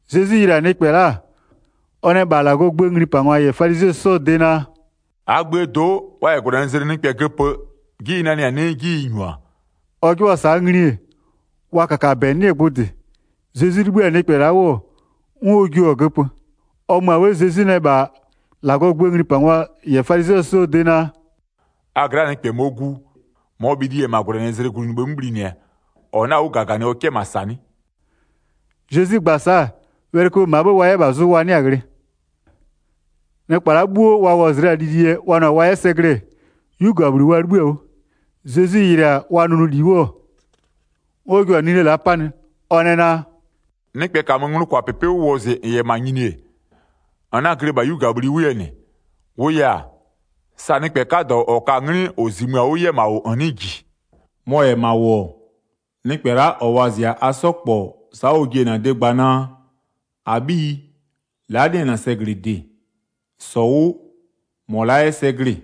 Zezwi yɩlɩ-a nɩkpɛ la'a, ɔ nɛ -bha -Lagɔɔ gböö nglipangwa -yɛ falizɩɛ 'sɔɔ de naa: “-Aa gböö do'o, wa -yɛ -gwlɛnɩzlɩ nɩkpɛ göpö 'ji ɩ nanɩ-a 'nɩɩ 'ji ɩ -nyu-a?” Ɔ 'jɩbhʋa-a sa'a ngli-e, wa -kakabɛ 'nɩ-ɛ gbʋ -dɩ. Zezwi 'libhï-a nɩkpɛ la'a 'wʋ, 'n ɔ jio-a göpö. Ɔ mö-a 'bhë Zezwi nɛ -bha -Lagɔɔ gböö nglipangwa -yɛ falizɩɛ 'sɔɔ de naa: “A gla'aa nɩkpɛ -mɔɔ gu, -mɔɔ bhili -yɛ-ɛ -ma -gwlɛnɩzlɩ glunyibhë 'mö bhlinɩ-ɛ, -ɔ 'na-a 'wʋ -gaganɩ ɔ 'kɛ -ma -sa 'nɩ?” Zezwi gba-a sa'a, wɛlɩköbhë -maa 'bhë wa 'yɛ -bha zʋ wa 'nɩa-a ghlɩ. Nɩkpa la'a 'bhuo wa wɔzɩ la-a lili yɛ wa nʋ-a wa 'yɛ sɛ glɩ-ɛ, 'yugabhli wa 'libhï-a 'wʋ. Zezwi yɩlɩ-a wa nʋnʋli 'wʋ, 'n ɔ jua-a nine la'a 'panɩ, ɔ nɛ naa: “Nɩkpɛ -kamö nglʋkwapɩpɩ 'wʋ wɔzɩ -n -yɛ -ma nyini-e, -n 'na-a glɩ -bha 'yugabhli 'wʋ yɛ -nɩ, -wʋʋ yɛ-a, sa nɩkpɛ 'kadɔ -ɔ ka-a 'nglɩ -ɔ -zimö-a 'wʋ 'yɛ -ma -wʋ -n 'nɩɩ -ji. Mɔ-ɔ -yɛ -ma -wʋ-ɔ, nɩkpɛ la'a -ɔ wɔzɩ-a a 'sɔ -kpɔ sa'a ɔ ji-e -bha -na de gbaa naa: -Abhiyi, la'a 'nɩ-ɛ -na sɛglɩde, -sɔ 'wʋ, -mɔ la'a 'yɛ sɛ glɩ-ɩ.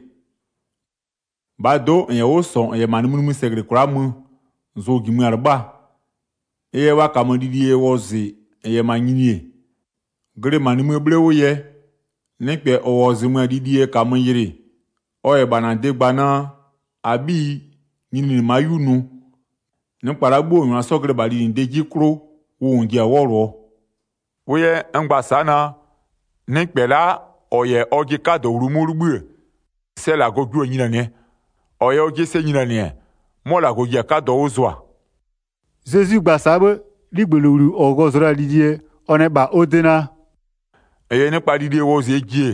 -Bhaa do'o -n 'yɛ 'wʋ -sɔ -n 'yɛ -ma nimï nimï sɛ -glɩ kwla'a mö, zʋ-ʋ -jimö-a 'lɩbhaa. Ɩ yɛ wa -kamö lili yɛ wɔzɩ -n -yɛ -ma nyini-e, glɩ -ma nimïë 'bhle 'wʋ yɛ, nɩkpɛ -ɔ -wɔzɩmö-a lili yɛ -kamö yɩlɩ, ɔ -yɛ -bha -na de gba naa: -Abhiyi nyininɩ ma'a 'yu nʋ, nɩkpa la'a 'bhuo -wa -n -nyʋa 'sɔ glɩ-ɛ -bha linɩdee 'jie 'klʋ, wʋ -n ji-a 'wɔlʋɔ. Ɩ yɛ n gba-a sa'a naa, nɩkpɛ la'a -ɔ -yɛ ɔjɩ 'kadɔ wlumö 'wʋ 'libhï-ë, sɛ -Lagɔ jio-a nyinianɩɛ, -ɔ -yɛ ɔjɩ sɛ nyinianɩ-ɛ, 'mɔ -Lagɔ ji-a 'kadɔ 'wʋ zʋa.” Zezwi gba-a sa'a 'bhë, 'ligbëlowli -ɔ wɔzɩɔ la-a lili yɛ, ɔ nɛ -bha ɔ de naa: “-N -yɛ nɩkpa lili yɛ wɔzɩɛ ji-e,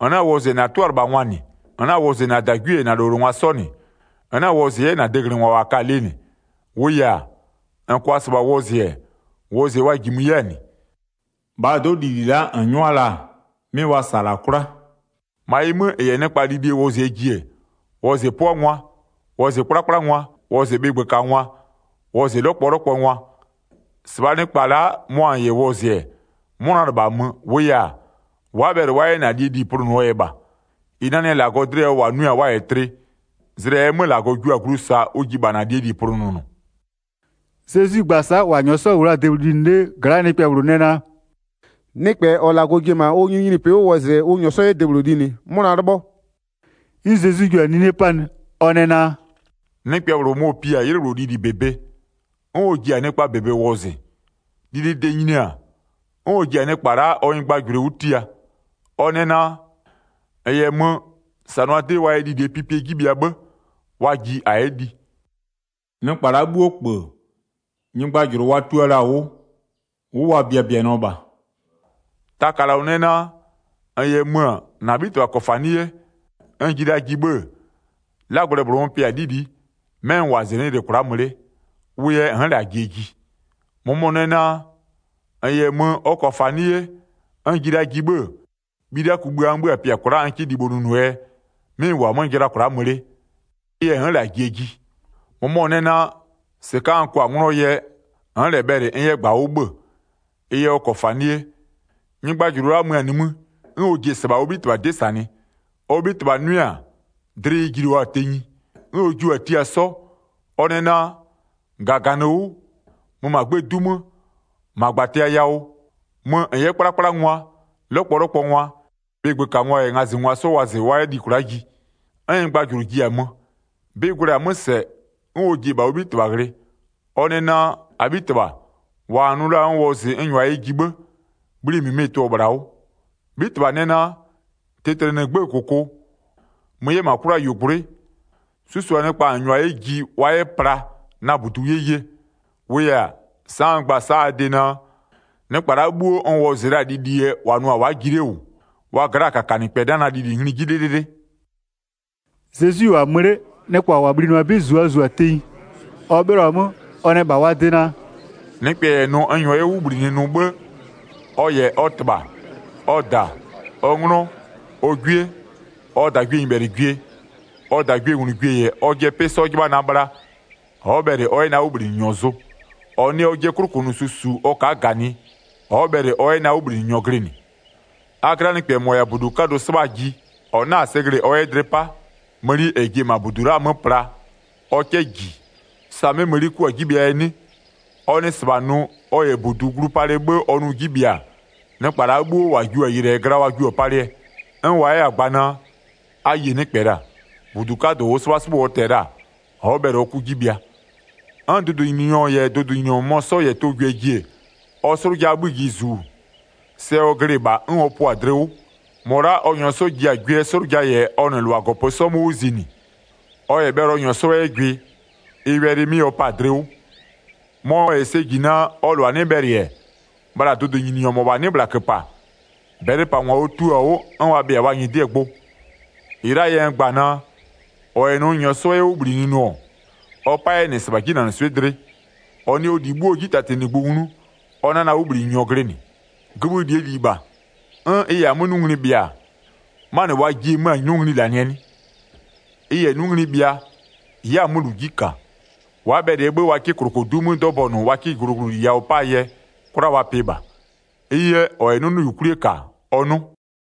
-n 'na-a wɔzɩ -na 'tʋalɩbhangwa -nɩ, -n 'na-a wɔzɩ -na -dagwie -yɛ -na -lowlengwa 'sɔ -nɩ, -n 'na-a wɔzɩ 'yɛ -na deglɩngwa -wa ka-a lɩ -nɩ. -Wʋʋ yɛ-a, -n -kʋa -sɩbha wɔzɩ-ɛ, wɔzɩɛ wa -jimö 'yɛ-a -nɩ. -Bhaa do'o, lili la'a -n 'nyʋa la-a 'mɩ wa -sa-a -la 'kwla. 13-Ma ɩ 'mö -n -yɛ nɩkpa lili yɛ wɔzɩɛ ji-e, wɔzɩ 'pʋangwa, wɔzɩ 'kplakplangwa, wɔzɩ bhɩgbökangwa, wɔzɩ 'lɔkpɔlɔkpɔngwa. 14-Sɩbhaa nɩkpa la'a, mʋa -n -yɛ wɔzɩ-ɛ, 'mʋna -lɩbhamö, -wʋʋ -yɛ-a, wa'a bhɛlɩ wa 'yɛ -na -lie -li plʋnʋɔ yɛ -bha. -Ɩ nanɩ-a -Lagɔ dlɩ yawʋ, -wa nʋɩ-a wa -yɛ tlɩ, zlɩ -ɛɛ 'mö -Lagɔ jua-a glu -saa ʋ ji -bha -na -lie -li plʋnʋnʋ.” Zezwi gba-a sa'a, -wa -nyɔɔ 'sɔ -wʋ la-a debhlʋ linɩ 'lee gla'aa nɩkpɛ -bhlʋ nɛ naa: “Nɩkpɛ -ɔ -Lagɔ ji-e -ma ɔ nyininyinipɩ 'wʋ wɔzɩɛ ʋ -nyɔɔ 'yɛ debhlʋ linɩ, 'mʋna 'lɩbhɔ.” 'N Zezwi jua-a 'nine 'panɩ, ɔ nɛ naa: “Nɩkpɛ -bhlʋ mɔ-ɔ pi-a 'ylɩ -bhlʋ lili -bebe, 'n ɔ ji-a nɩkpaa -bebe wɔzɩ. Lilide nyini-a, 'n ɔ ji-a nɩkpa la'a ɔ nyɩgbajʋlʋ 'wʋ tia, ɔ nɛ naa: -N -yɛ mö, -sanʋa 'dɩ wa yɛ lilie pipie 'ji bhɩa 'bhë, wa ji -a 'yɛ li. Nɩkpa la'a 'bhuo -kpö, nyɩgbajʋlʋ wa tua la-a 'wʋ, 'wʋ wa biabianɩɔ -bha. Taka -lɔ nɛ naa: -N -yɛ mö-ö, -na 'bhitɩbha -kɔfanɩ'ɩ 'ye, n ji la ji 'bhë-ë, 'lagblɛ -bhlʋ n pɩa-a 'lili'i, 'mɛ n -wʋ-a -zɩnɩ'ɩ yɩlɩ kwla'a mö 'le, wʋ yɛ n'n -lɛ-a jie ji. 19-Mʋmɔ nɛ naa: -N -yɛ mö, ɔ -kɔfanɩ'ɩ 'ye, n ji la ji 'bhë-ë, bhilia kugbïa n 'bhö-a pɩa kwla'a n 'kɩ libho nʋnʋɔ yɛ, 'mɩ n -wʋ-a 'mö jɩla kwla'a mö 'le, ɩ yɛ n'n -lɛ-a jie ji. 20-Mʋmɔ nɛ naa: -Sɩka'a n kwa-a 'nglɔɔ yɛ, n'n -lɛ bhɛlɩ n 'yɛ -gbawʋ 'bhö-ö, ɩ yɛ ɔ -kɔfanɩ'ɩ 'ye. Nyɩgbajʋlʋ la'a mö-a nimï, 'n ɔ ji-e -sɩbha ɔ 'bhitɩbha 'dɩ -sanɩ. Ɔ 'bhitɩbha 'nʋɩ-a, dlɩ ɩ jilio-a tenyi. 'N ɔ jio-a tia 'sɔ, ɔ nɛ naa: -Gaganɩ 'wʋ, mö -ma 'gbëë 'du 'mö, -ma -gbatɩa yawʋ, mö -n 'yɛ 'kplakplangwa, 'lɔkpɔlɔkpɔngwa, bhɩgbökangwa -yɛ ngazɩngwa 'sɔ wɔzɩ wa 'yɛ li kwla'a ji. 'N nyɩgbajʋlʋ ji-a mö, 'bɩ gwlɛ-a 'mö -sɛ, 'n ɔ ji-e -bha ɔ 'bhitɩbha ghlɩ, ɔ nɛ naa: -Abhitɩbha, -wa -n nʋ la-a n wɔzɩ n -nyʋa yɛ ji 'bhë, bhli -mɩmɩ-ɩ tʋ-ɔ -bhla 'wʋ. 'Bhitɩbha nɛ naa: Tɩtlɩnɩ 'gbëë -kʋkʋ, mö 'yɛ -ma 'kwlayuogblʋ'ʋɩ. 'Susʋa nɩkpa -n -nyʋa 'yɛ ji, wa 'yɛ pla na -budu 'yɛ ye. 24-Wʋʋ yɛ-a, sa'a n gba-a sa'a a de naa: Nɩkpa la'a 'bhuo n wɔzɩ la-a lili yɛ -wa nʋ-a wa'a ji 'le -wʋ, wa gla'aa -kakanɩkpɛ 'na na lili ngli 'jɩ 'lɩlɩlɩ.” Zezwi -wʋ-a mö 'le, nɩkpa -wa bhlinɩɔ-a 'bɩ -zu wa -zu-a tenyi. Ɔ 'bhɩlɔ-a 'mö, ɔ nɛ -bha wa de naa: “Nɩkpɛ -yɛ nʋ n -nyɔɔ yɛ 'wʋ -bhlinɩ nʋ 'bhë, ɔ -yɛ ɔ -tɩbha, ɔ -da, ɔ 'nglɔ, ɔ 'gwie, ɔ -dagwienyɩbhɛlɩgwie, ɔ -dagwienglugwie -yɛ ɔjɩɛ 'pɩ 'sɔ 'jɩbha na bhla, ɔ'ɔ bhɛlɩ ɔ 'yɛ na 'wʋbhlinɩnyɔ zʋ. 27-Ɔ nɩ ɔjɩɛ 'klʋkʋnʋsu -su ɔ ka'a -ganɩ ɔ'ɔ bhɛlɩ ɔ 'yɛ na 'wʋbhlinɩnyɔ glɩnɩ. A gla'aa nɩkpɛ -mɔ -yɛ-a -budu 'kadʋ 'sɩbhaa ji, -ɔ 'na-a sɛ glɩ-ɩ ɔ 'yɛ dlɩ 'pa, mëni -ɛ ji-e -ma -budu la'aa 'mö pla, ɔ 'kɛ -ji, sa 'mɛ mëni 'kʋ-a 'ji bhɩaa yɛ 'nɩ? Ɔ nɩ -sɩbha nʋ, ɔ -yɛ 'mʋ -budu glu palɩ 'bhë ɔ nʋ 'ji bhɩa-a, nɩkpa la'a bhuo -wa jio-a yɩlɩɛ gla wa jio-a palɩɛ. 'N wa 'yɛ-a gba naa: A yie nɩkpɛ -la, -budu 'kadʋ -ʋʋ 'sɩbhasɩbhʋ ɔ tɛ-ɛ la-a, ɔ'ɔ bhɛlɩ ɔ 'kʋ 'ji bhɩa. 'N dʋdʋnyininyɔ -bhlʋ -yɛ dʋdʋnyininyɔ -mʋmɔ 'sɔ -yɛ tʋ gwɩɛ ji-e, ɔ 'slʋjaa 'bhï ji -zu, sɛ ɔ glɩ-ɩ -bha, 'n ɔ pʋa-a dlɩ 'wʋ. -Mɔ la'a ɔ -nyɔɔ ji-a gwɩɛɛ 'slʋja -yɛ ɔ -nɩ -lʋa -gɔpö 'sɔ 'mö 'wʋ zinɩ, ɔ -yɛ bhɛlɩ ɔ -nyɔɔ 'sɔ 'yɛ gwɩ, ɩ wɛlɩ 'mɩ ɔ pa-a dlɩ 'wʋ. Mɔ -yɛ sɛ ji naa, ɔ -lʋa 'nɩ bhɛlɩ-ɛ, bhla dʋdʋnyininyɔ -mɔbha 'nɩ -bhla -köpa, -bɛlɩpangwa ɔ tio-a 'wʋ 'n wa bhɩa-a wa nyɩdɩɛ gbʋ. 33-Ɩ la'aa yɛ n gba-a naa: -Ɔ -yɛ nʋ n -nyɔɔ 'sɔ 'yɛ 'wʋ -bhlinɩ nʋ-ɔ, ɔ 'pa 'yɛ -nɩ -sɩbha 'jinanɩswɩ'ɩ dlɩ. Ɔ nɩ ɔ -li 'bhuoo 'ji 'tatinɩgbʋ nglu, ɔ 'na na 'wʋbhlinɩnyɔ glɩnɩ. Gïbhï -lie -li -bha, 'n ɩ -yɛ-a 'mö 'nʋ ngli bhɩa-a, 'manɩ wa jiɩ-e 'mö-a 'nʋ ngli -lanɩɛ 'nɩ? Ɩ -yɛ 'nʋ ngli bhɩa, ɩ'ɩ-a 'mö -lu 'ji -ka. Wa'a bhɛlɩɛ 'bhë wa 'kɩ -klokodu 'mö 'dɔbɔnʋ wa 'ka glʋglʋli yawʋ 'paa yɛ, 'kwla wa pɩ -bha. Ɩ yɛ, -ɔ -yɛ 'nʋnʋyukwlie -ka ɔ 'nʋ.”